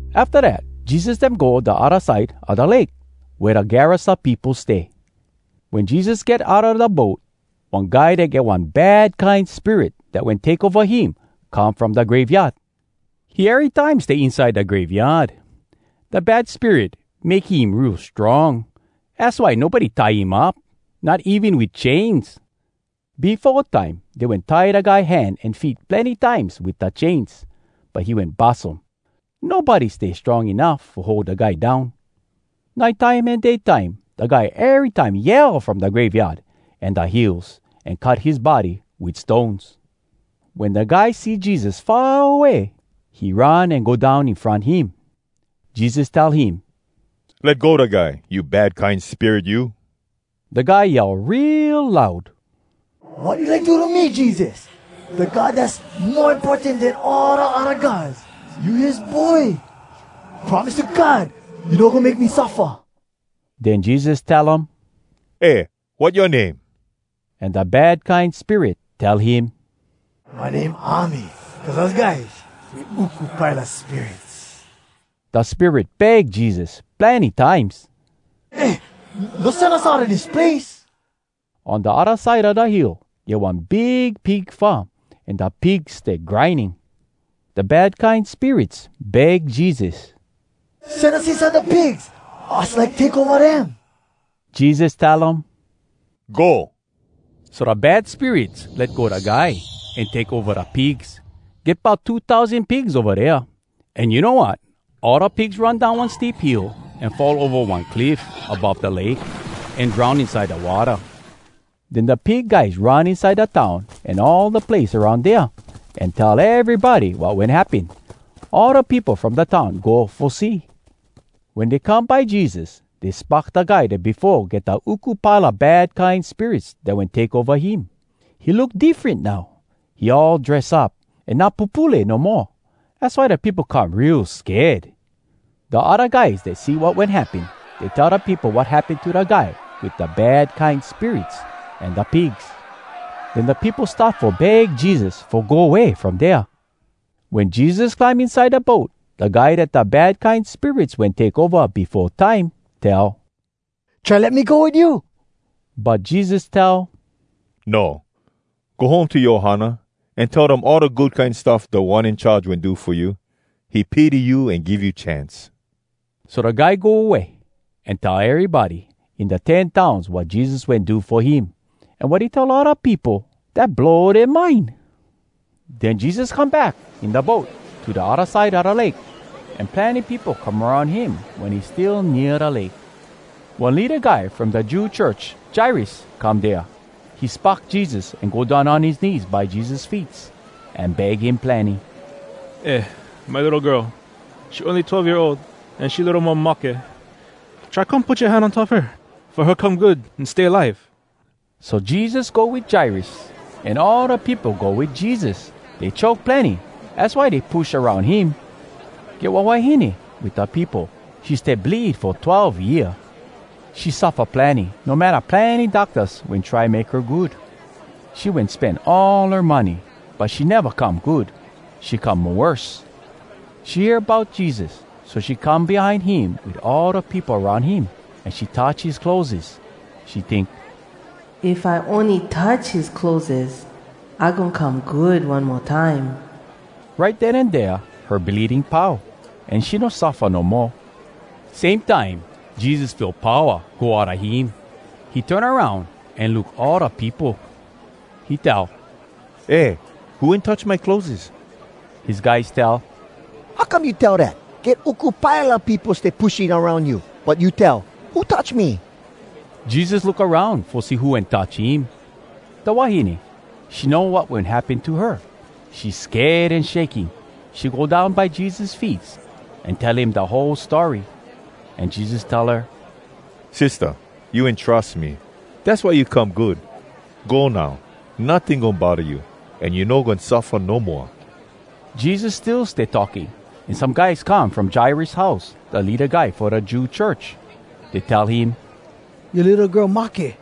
Afta dat, Jesus dem go da odda side a da lake wea da Gerasa peopo stay. Wen Jesus get outa da boat, one guy dat get one bad kine spirit dat wen take ova him come from da graveyard. He erytime stay inside da graveyard. Da bad spirit make him real strong. Az why nobody tie him up, not even wit chains. Befo time, dey wen tie da guy hand an feet plenny times wit da chains, but he wen bus um. Nobody stay strong enuff fo hold da guy down. Nite time an day time, da guy erytime yell from da graveyard, an da hills, an cut his body wit stones. Wen da guy see Jesus far away, he run an go down in front him. Jesus tell him, “Let go da guy, you bad kine spirit you!” Da guy yell real loud, “Wat you like do to me, Jesus? Da God Dass Mo Importan Den All Da Odda Gods, you his Boy! Promise to God you no goin make me suffa!” Den Jesus tell um, “Eh, wat yoa name?” An da bad kine spirit tell him, “My name ‘Army,’ cuz us guys, we uku pile a spirits!” Da spirit beg Jesus plenny times, “Eh, no sen us outa dis place!” On da odda side a da hill, get one big pig farm, an da pigs stay grinding. Da bad kine spirits beg Jesus, “Sen us inside da pigs! Us like take ova dem.” Jesus tell um, “Go!” So da bad spirits let go da guy, an take ova da pigs. Get bout two tousan pigs ova dea. An you know wat? All da pigs run down one steep hill an fall ova one cliff above da lake, an drown inside da watta. Den da pig guys run inside da town an all da place aroun dea an tell erybody wat wen happen. All da peopo from da town go fo see. Wen dey come by Jesus, dey spock da guy dat befo get da uku pile a bad kine spirits dat wen take ova him. He look diffren now. He all dress up, an not pupule no moa. Az why da peopo come real sked. Da odda guys dat see wat wen happen, dey tell da peopo wat happen to da guy wit da bad kine spirits an da pigs. Den da peopo start fo beg Jesus fo go way from dea. Wen Jesus climb inside da boat, da guy dat da bad kine spirits wen take ova befo time tell, “Try let me go wit you.” But Jesus tell, “No. Go home to yoa ohana, an tell dem all da good kine stuff Da One In Charge wen do fo you. He pity you an give you chance.” So da guy go way, an tell erybody in da Ten Towns wat Jesus wen do fo him. An wat he tell all da peopo, dat blow dea mind. Den Jesus come back in da boat to da odda side a da lake. An plenny peopo come aroun him wen he still nea da lake. One leada guy from da Jew church, Jairus, come dea. He spock Jesus, an go down on his knees by Jesus feets an beg him plenny, “Eh, my litto girl, she ony twelve year ol, an she litto mo mahke. Try come put yoa hand on top her, fo her come good an stay alive!” So Jesus go wit Jairus. An all da peopo go wit Jesus. Dey choke plenny, az why dey push aroun him. Get one wahine wit da peopo. She stay bleed fo twelve year. She suffa plenny, no matta plenny doctas wen try make her good. She wen spen all her money, but she neva come good. She come mo worse. She hear bout Jesus, so she come behind him wit all da peopo aroun him, an she touch his clotheses. She tink, “If I ony touch his clotheses, I goin come good one mo time.” Right den an dea her bleeding pau, an she no suffa no moa. Same time, Jesus feel powa go outa him. He turn aroun an look all da peopo. He tell, “Eh, who wen touch my clotheses?” His guys tell, “How come you tell dat? Get uku pile a peopo stay pushing aroun you. But you tell ‘Who touch me?’” Jesus look aroun fo see who wen touch him. Da wahine, she know wat wen happen to her. She sked an shaking. She go down by Jesus feets, an tell him da whole story. An Jesus tell her, “Sistah, you wen trus me. Dass why you come good. Go now, notting goin bodda you. An you no goin suffa no moa.” Jesus still stay talking, an some guys come from Jairus house, da leada guy fo da Jew church. Dey tell him, “Yoa litto girl mahke!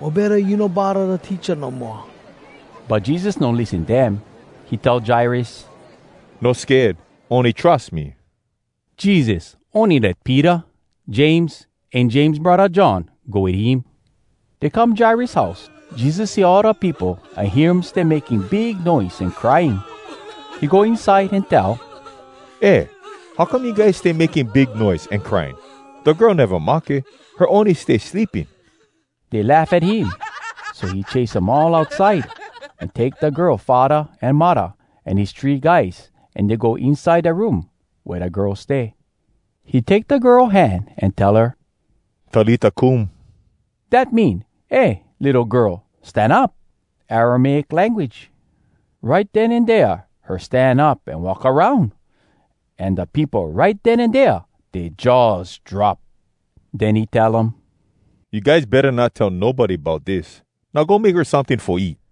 Mo betta you no bodda da teacha no moa.” But Jesus no lissen dem. He tell Jairus, “No sked. Ony trus me.” Jesus ony let Peter, James, an James braddah John go wit him. Dey come Jairus house. Jesus see all da peopo an hear um stay making big noise an crying. He go inside an tell, “Eh, how come you guys stay making big noise an crying? Da girl neva mahke, her ony stay sleeping.” Dey laugh at him. So he chase um all outside, an take da girl faddah an muddah, an his three guys, an dey go inside da room wea da girl stay. He take da girl hand an tell her, “Talita kum,” Dat mean, “Eh! Litto girl, stan up!” Aramaic language. Right den an dea her stan up an walk aroun! An da peopo, right den an dea, dea jaws drop. Den he tell um, “You guys betta not tell nobody bout dis! Now go make her someting fo eat.”